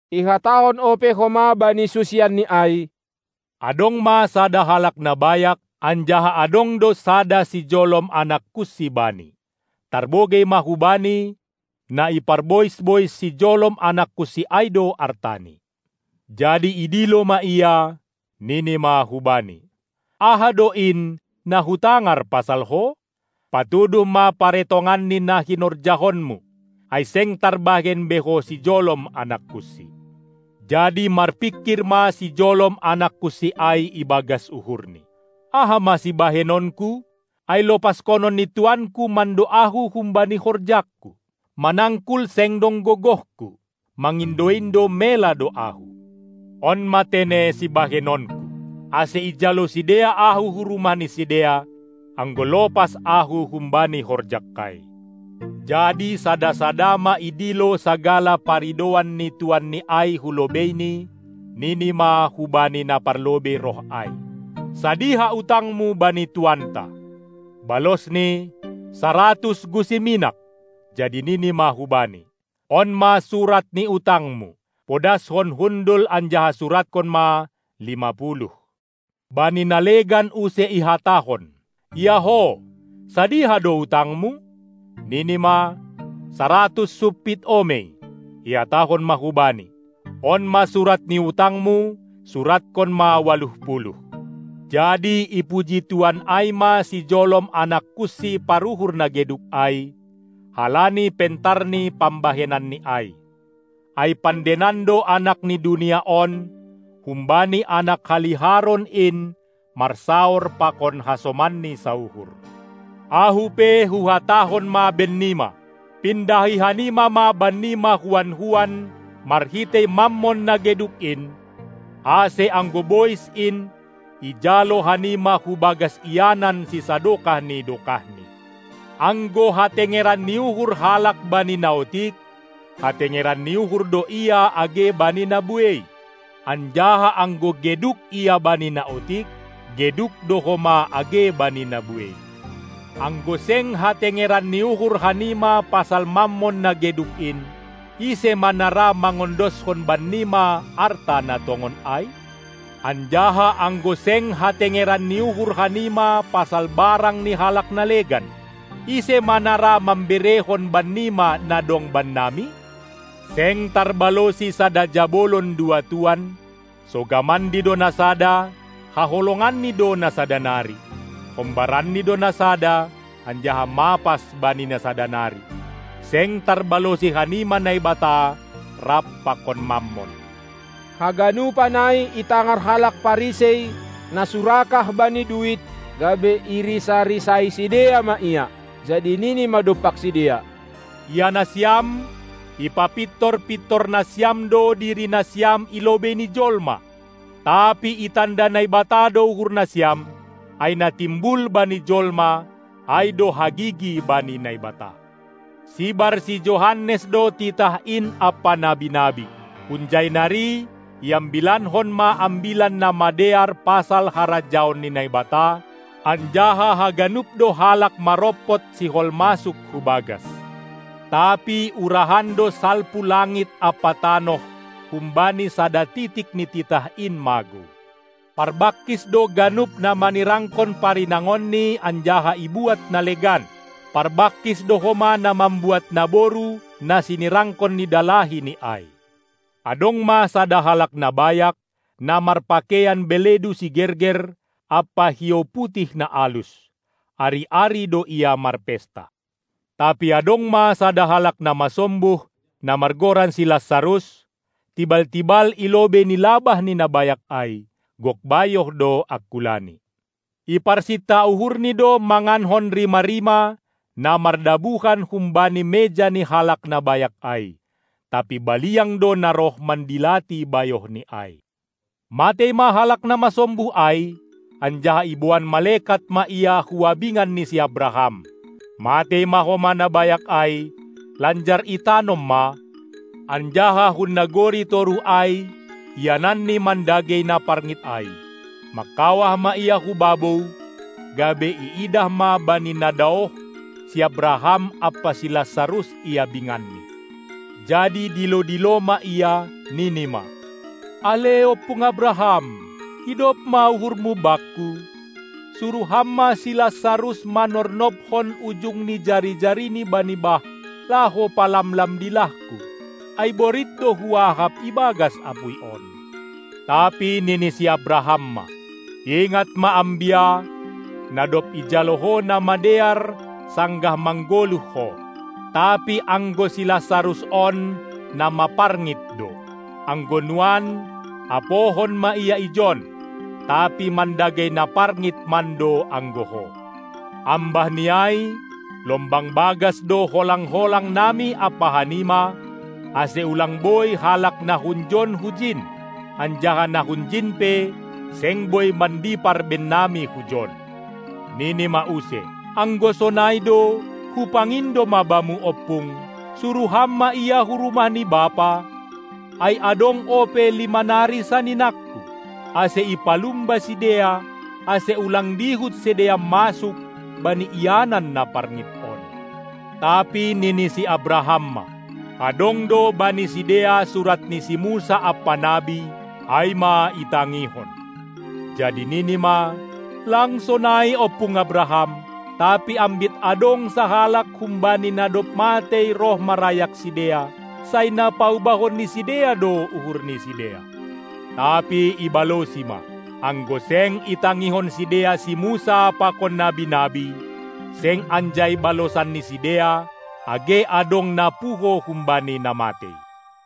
Ihatahon ope homa bani susianNi ai: Adong ma sada halak na bayak, anjaha adong do sada sijolom anak kunsi bani. Tarbogei ma hubani, na iparbois-bois sijolom anak kunsi ai do artani. Jadi idilo ma ia, nini ma hubani: Aha do in, na hutangar pasal ho? Patuduh ma paretongan ni na hinorjahonmu! Ai seng tarbahen be ho sijolom anak kunsi. Jadi marpingkir ma sijolom anak kunsi ai ibagas uhurni: Aha ma sibahenonku, ai lopaskonon ni tuanku mando ahu humbani horjangku? Manangkul seng dong gogohku, mangindo-indo mela do ahu. On ma tene sibahenonku, ase ijalo sidea ahu hu rumah ni sidea, anggo lopas ahu humbani horjangkai. Jadi sada-sada ma idilo sagala paridouan ni tuanni ai hu lobeini, nini ma hubani na parlobei roh ai: Sadiha utangmu bani tuanta? Balosni: Saratus gusi minak. Jadi nini ma hubani: On ma surat ni utangmu, podashon hundul anjaha suratkon ma: lima puluh! Bani na legan use ihatahon: Ia ho, sadiha do utangmu? Nini ma: Saratus sumpit omei. Ihatahon ma hubani: On ma surat ni utangmu, suratkon ma: ualuh puluh! Jadi ipuji tuan ai ma sijolom anak kunsi paruhur na geduk ai, halani pentar ni pambahenanni ai. Ai pandeinan do anak ni dunia on humbani anak haliharon in marsaor pakon hasomanni sauhur. Ahu pe, huhatahon ma bennima: Pindahi hanima ma bannima huan-huan marhitei Mammon na geduk in, ase anggo bois in, ijalo hanima hubagas ianan sisadokah ni dokahni. Anggo hatengeran ni uhur halak bani na otik, hatengeran ni uhur do ia age bani na buei, anjaha anggo geduk ia bani na otik, geduk do homa age bani na buei. Anggo seng hatengeran ni uhur hanima pasal Mammon na geduk in, ise ma na ra mangondoskon bannima arta na tongon ai? Anjaha anggo seng hatengeren ni uhur hanima pasal barang ni halak na legan, ise ma na ra mamberehon bannima na dong Bannami. Seng tarbalosi sada jabolon dua tuan, sogamanni do na sada, haholonganni do na sada nari; hombaranni do na sada, anjaha mapas bani na sada nari. Seng tarbalosi hanima Naibata rap pakon Mammon. Haganupan ai itangar halak Parisei, na surakah bani duit, gabe irisa-risai sidea ma Ia. Jadi nini ma dompak sidea: Ia nasiam, ipapintor-pintor nasiam do diri nasiam i lobei ni jolma, tapi itanda Naibata do uhur nasiam, ai na timbul bani jolma, ai do hagigi bani Naibata. Sibar si Johannes do titah in ampa nabi-nabi. Hunjai nari iambilankon ma ambilan na madear pasal harajaon ni Naibata, anjaha haganup do halak marompot sihol masuk hu bagas. Tapi urahan do salpu langit ampa tanoh humbani sada titik ni titah in magou. Parbangkis do ganup na manirangkon parinangonni anjaha ibuat na legan; parbangkis do homa na mambuat naboru na sinirangkon ni dalahi ni ai. Adong ma sada halak na bayak, na marpakeian beledu sigerger ampa hiou putih na alus, ari-ari do ia marpesta. Tapi adong ma sada halak na masombuh, na margoran si Lasarus, tibal-tibal i lobei ni labah ni na bayak ai; gok bayoh do angkulani. Iparsinta uhurni do mangankon rima-rima, na mardabuhan humbani meja ni halak na bayak ai; tapi baliang do na roh mandilati bayohni ai. Matei ma halak na masombuh ai, anjaha iboan malekat ma ia hu abingan ni si Abraham. Matei ma homa na bayak ai, lanjar itanom ma, anjaha hun nagori toruh ai, iananni mandagei na parngit ai, mangkawah ma ia hu babou, gabe iidah ma bani na daoh, si Abraham ampa si Lasarus i abinganni. Jadi dilo-dilo ma ia, nini ma: Ale ompung Abraham! Idop ma uhurmu bakku, suruh ham ma si Lasarus manornobhon ujung ni jari-jarini bani bah, laho palamlam dilahku, ai borit do huahap ibagas apuy on. Tapi nini si Abraham ma: Ingat ma, ambia, na dob ijalo ho na madear, sanggah manggoluh ho, tapi anggo si Lasarus on na maparngit do. Anggo nuan apohon ma ia ijon, tapi mandagei na parngit mando anggo ho. Ambah ni ai, lombang bagas do holang-holang nami ampa hanima, ase ulang boi halak na hunjon hujin, anjaha na hunjin pe seng boi mandipar bennami hujon. Nini ma use: Anggo sonai do, hupangindo ma bamu ompung, suruh ham ma ia hu rumah ni bapa, ai adong ope lima nari saninangku, ase ipalumba sidea, ase ulang dihut sidea masuk bani ianan na parngit on. Tapi nini si Abraham ma: Adong do bani sidea surat ni si Musa ampa nabi, ai ma itangihon. Jadi nini ma: Lang sonai, ompung Abraham; tapi ambit adong sahalak humbani na dob matei roh marayak sidea, sai na paubahon ni sidea do uhur ni sidea. Tapi ibalosi ma: Anggo seng itangihon sidea si Musa pakon nabi-nabi, seng anjai balosan ni sidea, age adong na puho humbani na matei.